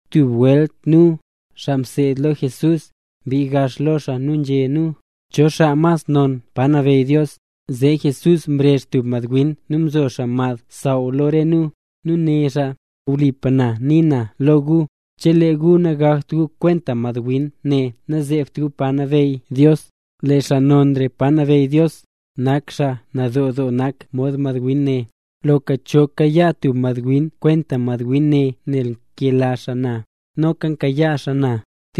Tub welt nu, xaa mseed lo Jesús, mbii gax lo xaa nu nzhé nu: —¿Cho xaa mas non pa nabeyy Dios? Zee Jesús mrezh tub madwin nu mzo xaa mad xsaww lo re nu. Nu né xaa: —Wlipa na nii na lo gu, chelee gu nagakt gu kwent madwin ne nazeebt gu pa nabeyy Dios. Lee xaa nonra pa nabeyy Dios, nak xaa nadoo doo nak mod madwin ne. Loka cho kayaa tub madwin kwenta madwin ne nel nkela xaa na, noka nkayaa xaa na.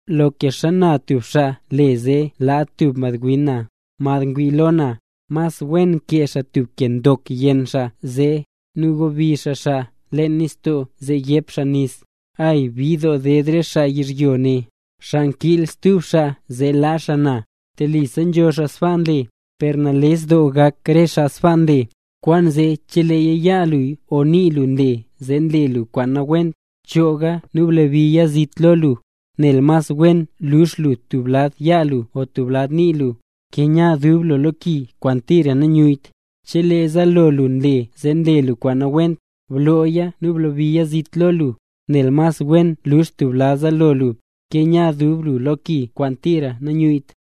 ’Loka xana tub xaa le zee laa tub madwin na, mad ngwii lo na; mas wen kee xaa tub ke ndok yenn xaa zee, nu gobi xaa xaa leen nistoo zee yep xaa nis. ¡Ay! Bid doo ded re xaa yizhyo, xaa nkiil stub xaa zee laa xaa na. Telisa nzho xaa sbaa nle, per nales doo gak re xaa sbaa nle. ’Kwaanzee chelee yaa lu o nii lu nle zee nle lu kwaan nawent, chooga nu blabiya zit lo lu, nel mas wen lux lu tub lad yaa lu o tub lad nii lu, ke nya dub lu lo ki kwaan tira nanyuyyt. Chelee zaalo lu nle zee nle lu kwaan nawent, blooya nu blabiya zit lo lu, nel mas wen lux lu tub zaalo lu, ke nya dub lu lo ki kwaan tira nanyuyyt.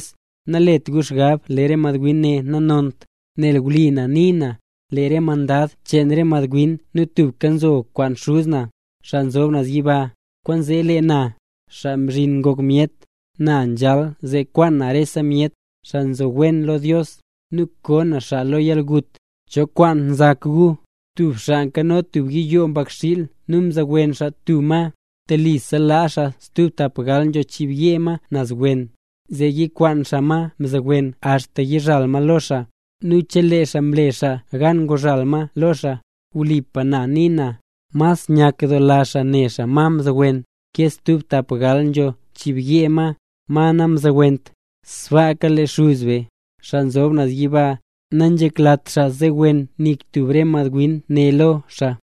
’Nalet gu xgab lee re madwin ne nanont, nel wli na nii na, lee re mandad cheen re madwin ne tubka nzo kwaan Xuz na, xaa nzob naz yiba. Kwaanzee lee na, Xaa Mzhin Ngok Myet, na nzhal zee kwaan na rese myet, xaa mzowen Dios lo, nu koo na xaa lo yalgut. ’¿Cho kwaan nzak gu? Tub xaa nkano tub yiyoo mbakxiil nu mzowen xaa tub ma. Telisa laa xaa stub tapgal nzho chiibyee ma naz wen, zee yikwaan xaa ma mzowen axta yizhal ma lo xaa. Nu chelee xaa mle xaa gan nguzhal ma lo xaa, wlipa na nii na, mas nyakdoola xaa ne xaa ma mzowen, ke stub tapgal nzho chiibyee ma, ma namzowent. Sbaaka le Xuz be, xaa nzob naz yiba, nanzheklat xaa zowen nik tub re madwin ne lo xaa.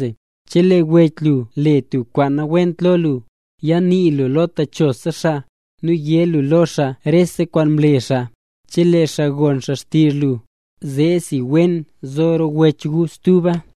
’Chelee wech lu le tub kwaan nawent lo lu, yanii lu lo techosa xaa, nu yé lu lo xaa rese kwaan mle xaa. Chelee xaa gon xaa xtizh lu, zeesi wen zo rop wech gu stuba.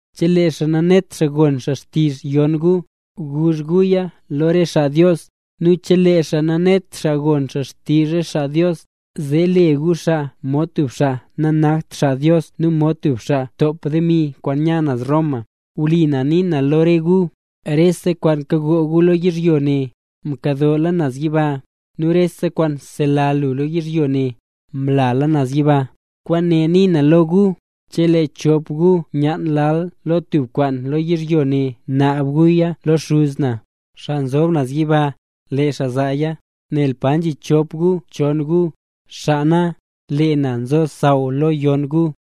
Chelee xaa nanet xaa gon xaa xtizh yon gu, guzh guya lo re xaa Dios. Nu chelee xaa nanet xaa gon xaa xtizh re xaa Dios, zee le gu xaa mod tub xaa nanakt xaa Dios nu mod tub xaa ntop demi kwaan nya naz Roma. Wli na nii na lo re gu, rese kwaan kado gu lo yizhyo ne, nkadoola naz yiba; nu rese kwaan sela gu lo yizhyo ne, mlala naz yiba. ’Kwaane nii na lo gu: Chelee chop gu myaan lal lo tub kwaan lo yizhyo ne naab guya lo Xuz na, xaa nzob naz yiba, lee xaa zaaya. Nel pa nzhi chop gu o chon gu, xaa nak xaa na, lee na nzo xsaww lo yon gu.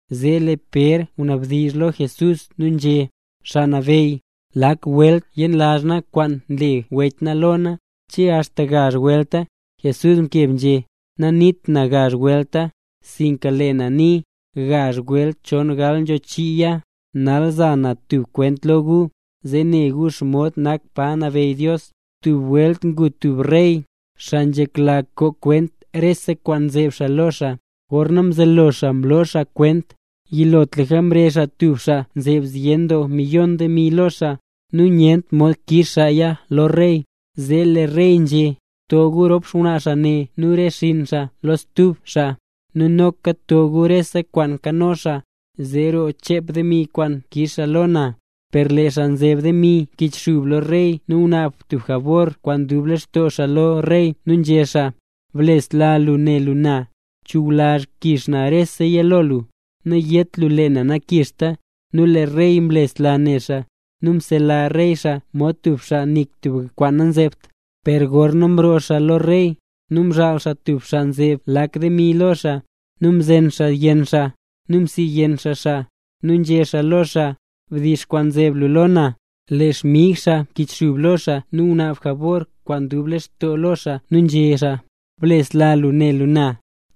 Zee lee Pér ngwanabdizh lo Jesús nu nzhé: —Xaa Nabeyy, ¿lak welt yenlazh na kwaan mle wech na lo na? ¿Che axta gazh welta? Jesús mkeb nzhé: —Naniit na gazh welta, sinka lee na nii, gazh welt chongal nzho chiiya. ’Nal za na tub kwent lo gu, zee ne gu xomod nak pa nabeyy Dios. Tub welt ngu tub rey, xaa nzhekla koo kwent rese kwaan nzeb xaa lo xaa. Gorna mzelo xaa mloo xaa kwent, yilotlaka mrezh xaa tub xaa nzeb zyen doo miyon demi lo xaa. Nu nyent mod kix xaaya lo rey, zee lee rey nzhé: “To gu rop xngwnaa xaa ne, nu re xinn xaa lo stub xaa, nu noka to gu rese kwaan nkano xaa, zee roo chep demi kwaan kix xaa lo na”. Per lee xaa nzeb demi mkichxub lo rey nu ngunaab tub jabor kwaan dub lextoo xaa lo rey nu nzhé xaa: “Blesla lu ne lu na; chuwlazh kix na reseya lo lu. Nayét lu lee na nakixta.” Nu lee rey mlesla ne xaa, nu msela rey xaa mod tub xaa nik tub kwaan nanzebt. ’Per gorna mroo xaa lo rey, nu mzhaal xaa tub xaa nzeb lakse demi lo xaa, nu mzen xaa yenn xaa, nu msiyenn xaa xaa, nu nzhé xaa lo xaa: “¡Bdix kwaan nzeb lu lo na!” Lee xmig xaa mkichxub lo xaa nu ngunaab jabor kwaan dub lextoo lo xaa nu nzhé xaa: “Blesla lu ne lu na;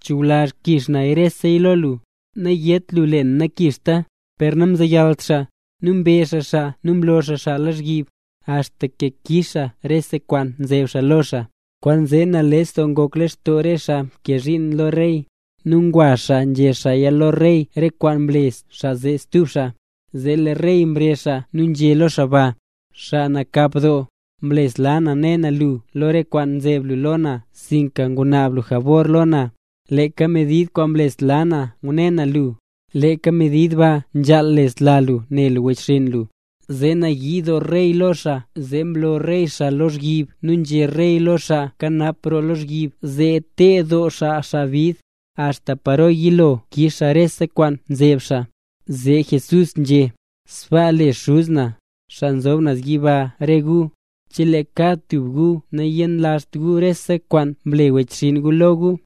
chuwlazh kix na reseya lo lu. Nayét lu lee na nakixta.” Per namzeyalt xaa, nu mbezh xaa xaa nu mloo xaa xaa lozhyib, axta ke kix xaa re kwaan nzeb xaa lo xaa. Kwaanzee nales doo ngok lextoo re xaa nkee zhiin lo rey. Nu ngwa xaa nzhé xaaya lo rey, re kwaan mle xaa zee stub xaa. Zee lee rey mrezh xaa nu nzhé lo xaa ba: “¡Xaa nakap doo! Mlesla na ne na lu lo re kwaan nzeb lu lo na sinka ngunaab lu jabor lo na. Leeka medid kwaan mlesla na ngune na lu, leeka medid ba nzhaal lesla lu ne lu wechxinn lu.” Zee nayii doo rey lo xaa nu zee mloo rey xaa lozhyib, nu nzhé rey lo xaa nkanap roo lozhyib, zee teed doo xaa xaa bid, axta paro yilo kix xaa rese kwaan nzeb xaa. Zee Jesús nzhé: —Sbaa le Xuz na, xaa nzob naz yiba re gu, chelee kad tub gu nayenlazht gu rese kwaan mle wechxinn gu lo gu.